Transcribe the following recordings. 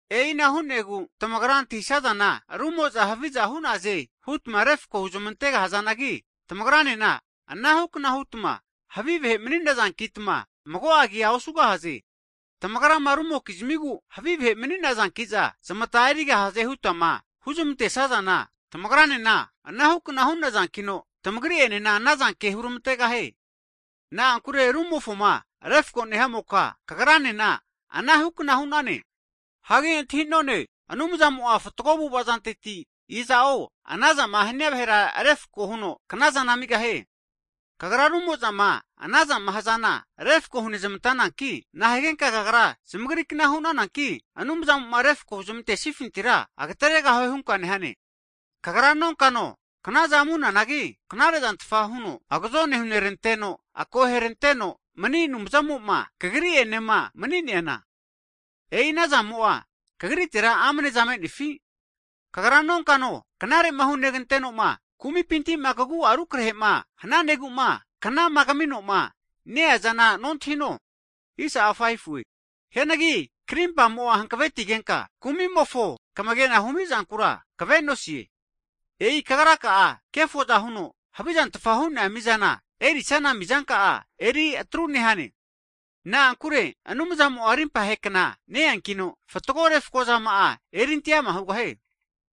E'ina hu'negu tamagra antahisazana rumo'za haviza hu'naze hutma refko huzmante gahazanagi, tamagranena anahukna hutma havi vahe mani'nazankitma mago'a kea osugahaze. Tamagrama rumokizmigu havi vahe maninazankiza zamata erigahaze hutama huzmantesazana, tamagranena anahukna hu'nazankino, tamagri'enena anazanke hurmantegahie. Na'ankure rumofoma refko nehamoka, kagranena ana hukna hu'nane. Hagi antahi'none, Anumzamo'a fatgo avu'avazanteti, iza'o anazama hania vahera refko huno knazana amigahie. Kagra rumozama anazama hazana refko hunezmantananki, nahigenka kagra zamagrikna hunananki, Anumzamo'ma refko huzmantesnifintira agateregahue hunka nehane? Kagra nonkano knaza amunanagi knarezantfa huno agazone huneranteno, akoheranteno mani Anumzamo'ma kagri'enema mani'neana? E'i anazamo'a kagritera amneza me'nefi? Kagra nonkano knare'ma hunegantenoma kumipintima kagu'a rukrahema hnazegu'ma knama kaminoma ne-eazana nontahino? Hianagi krimpa'mo hankavetigenka kumimofoma kamagena humizankura kavenosie. E'i kagra'a, kefoza huno havizantfa hu'nea mizama erisana mizanka'a eri atru nehane. Na'ankure Anumzamo'a rimpahe kna ne-enkino fatgo refakozama'a erinte'ama hugahie.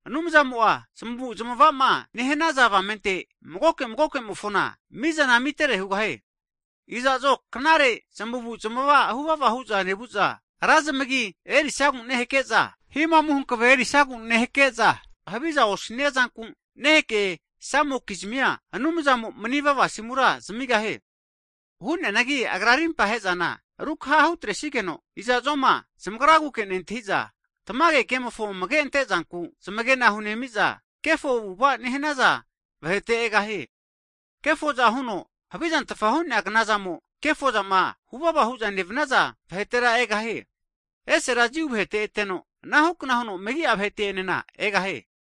Anumzamo'a zmavu'zamavama nehanaza avamente, magoke magokemofona mizana amitere hugahie. Iza'zo knare zamuzma huvava hu'za nevu'za, ra zmagima erisagu nehake'za, himamu hankave erisigu nehake'za, haviza osniazanku nehakesamokizmia, Anumzamo manivava zmasimura zamigahie. Hu'neanagi Agra rimpa he'zana rukaha hutresigeno, iza'zoma zamagraguke nentahiza, tamage ke'mofo amage'ante zanku zamagena hunemiza, kefo avu'ava nehanaza vahete egahie. Kefoza huno havizantfa hu'nea knazamo, kefozama huvava hu'za nevanaza vahetera egahie. Esera Jiu vahete eteno, anahukna huno megi'a vahete enena egahie.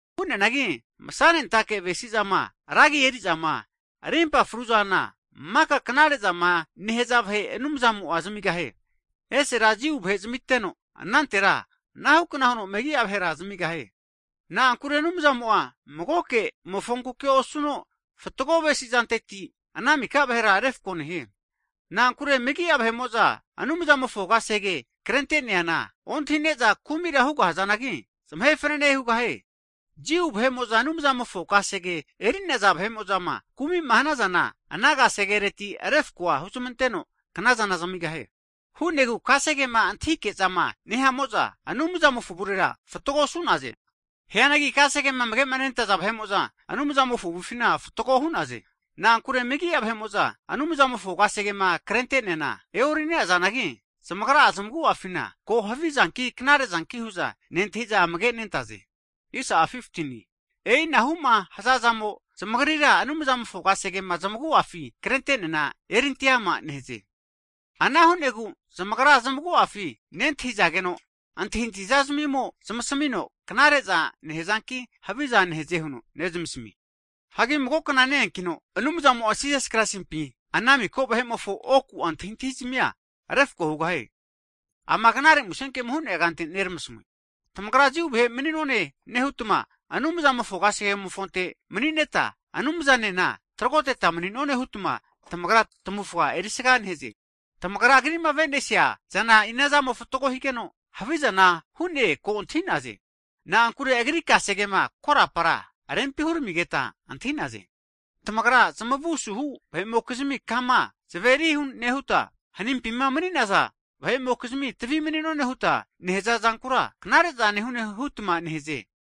Hu'neanagi masanentake avasesezama, ragi eri'zama, rimpa fruzana makama knare'zama nehza vahe Anumzamo'a zamigahie. Esera Jiu vahe zamiteno, anantera anahukna huno megi'a vahera zamigahie. Na'ankure Anumzamo'a magoke mofonkuke osuno, fatgo avesizanteti ana miko vahera refko nehie. Na'ankure megi'a vahe'mo'za Anumzamofo kasege krenteneana ontahine'za kumira hugahazanagi, zamahe fanene hugahie. Jiu vahe'mo'za Anumzamofo kasege eri'naza vahe'mozama kumi'ma hanazana, ana kasegereti refkoa huzmanteno knazana zamigahie. Hu'negu kasegema antahike'zama nehamo'za, Anumzamofo avurera fatgo osu'naze. Hianagi kasegema amage nentaza vahe'mo'za Anumzamofo avufina fatgoa hu'naze. Na'ankure megi'a vahe'mo'za Anumzamofo kasegema krente'neana e'orinazanagi, zamagra zamagu'afina ko havizanki knarezanki hu'za nentahiza amage nentaze. E'inahuma hazazamo zamagrira Anumzamofo kasegema zamagu'afi krenteneana erinteama nehaze. Ana hu'negu zamagra zamagu'afi nentahizageno, antahintahiza'zmimo zmasamino, knare'za nehazanki haviza nehaze huno nezmasamie. Hagi mago kna ne-enkino Anumzamo'a Jisas Kraisimpi ana miko vahe'mofo oku'a antahintahizmia refko hugahie. Ama knare musenkemo hu'nea kante neramasamue. Tamagra Jiu vahe mani'none nehutma, Anumzamofo kasegemofonte manineta, Anumzamo'ene tragoteta mni'none hutma tamagra tamavufa erisaga nehaze. Tamagra Agri'ma avesinea zana inazamo fatgo higeno, havizana hune ko antahinaze. Na'ankure agri kasegema korapa rempi huramigeta antahi'naze. Tamagra zamavu asuhu vahe'mokizmi kama zamaveri nehuta, hanimpima mani'naza vahe'mokizmi tavi mni'none huta nehaza zankura, knare'za nehune hutma nehaze.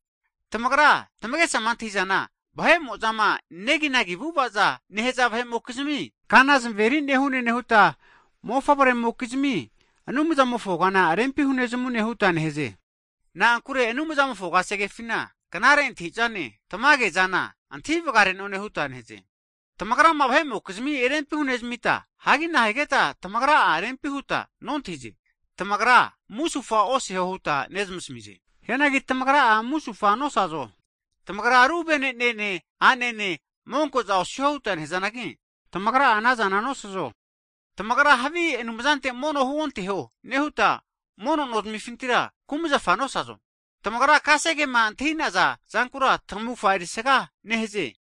Tamagra tamagesama antahizana vahe'mo'zama neginagi avu'avaza nehaza vahe'mokizmi kana zamaveri nehune nehuta, mofavremokizmi Anumzamofo kana rempi hunezamune huta nehaze. Na'ankure Anumzamofo kasegefina, knare antahizane tamage'zana antahi vgare'none huta nentahize. Tamagrama vahe'mokizmi rempi hunezamita, hagi nahigeta tamagra'a rempi huta nontahize? Tamagra musufa oseho huta nezmasamize. Hianagi tamagra'a musufa nosazo? Tamagra ru venenene anene monkoza osiho huta nehazanagi, tamagra'a anazana nosazo? Tamagra havi anumzante mono huonteho nehuta, mono nozmifintira kumzafa nosazo? Tamagra kasegema antahinaza zankura tamufga erisaga nehaze.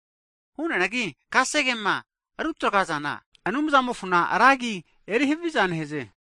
Hu'neanagi kasegema rutagrazana Anumzamofona ra agi eri haviza nehaze.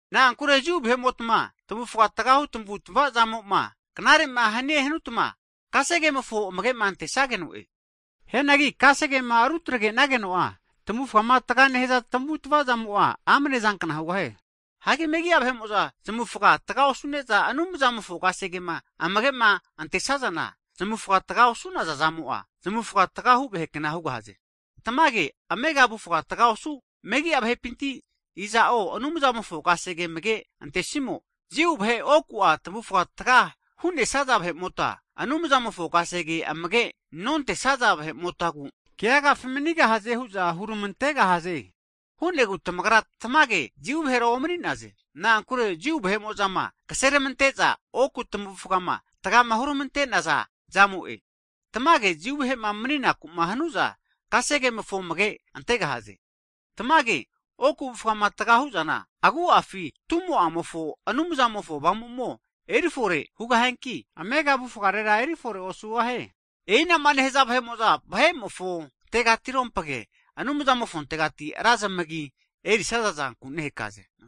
Na'ankure Jiu vahe'motma tavufga tgahu tamavutamava zamoma knarema hanie hanutma, kasegemofo amagema antesageno'e. Hianagi kasegema rutagrenageno'a tamavufga taga nehaza tamavutamavazamo'a amne'zankna hugahie. Hagi megia vahe'mo'za zamavufga taga osune'za, Anumzamofo kasegema amagema'antesazana, zamufga taga osu'naza zamo'a zamufga tgahu vahekna hugahaze. Tamage amega avufga tga osu, megi'a vahepinti iza'o Anumzamofo kasege amagema antesimo, Jiu vahe oku tamavufga tga hu'nesaza vahe'mota Anumzamofo kasege amage nontesaza vahe'motagu keagafi manigahaze hu'za hurmantegahaze. Hu'negu tamagra tamage Jiu vahera omani'naze. Na'ankure Jiu vahe'mo'zama kasenermante'za oku tamavufga tgama hurmante'naza zamo'e. Tamage Jiu vahema mni'nakuma hanuza, kasegemofo amage antegahaze. Tamage oku avufgama tga huzana agu'afi tumo'amofo Anumzamofo Avamumo erifore hugahianki, amega avufgare erifore osugahie. E'inama nehaza vahe'mo'za vahe'mofo tegatirompage, Anumzamofontegati ra zmagima erisaza zanku nehakaze.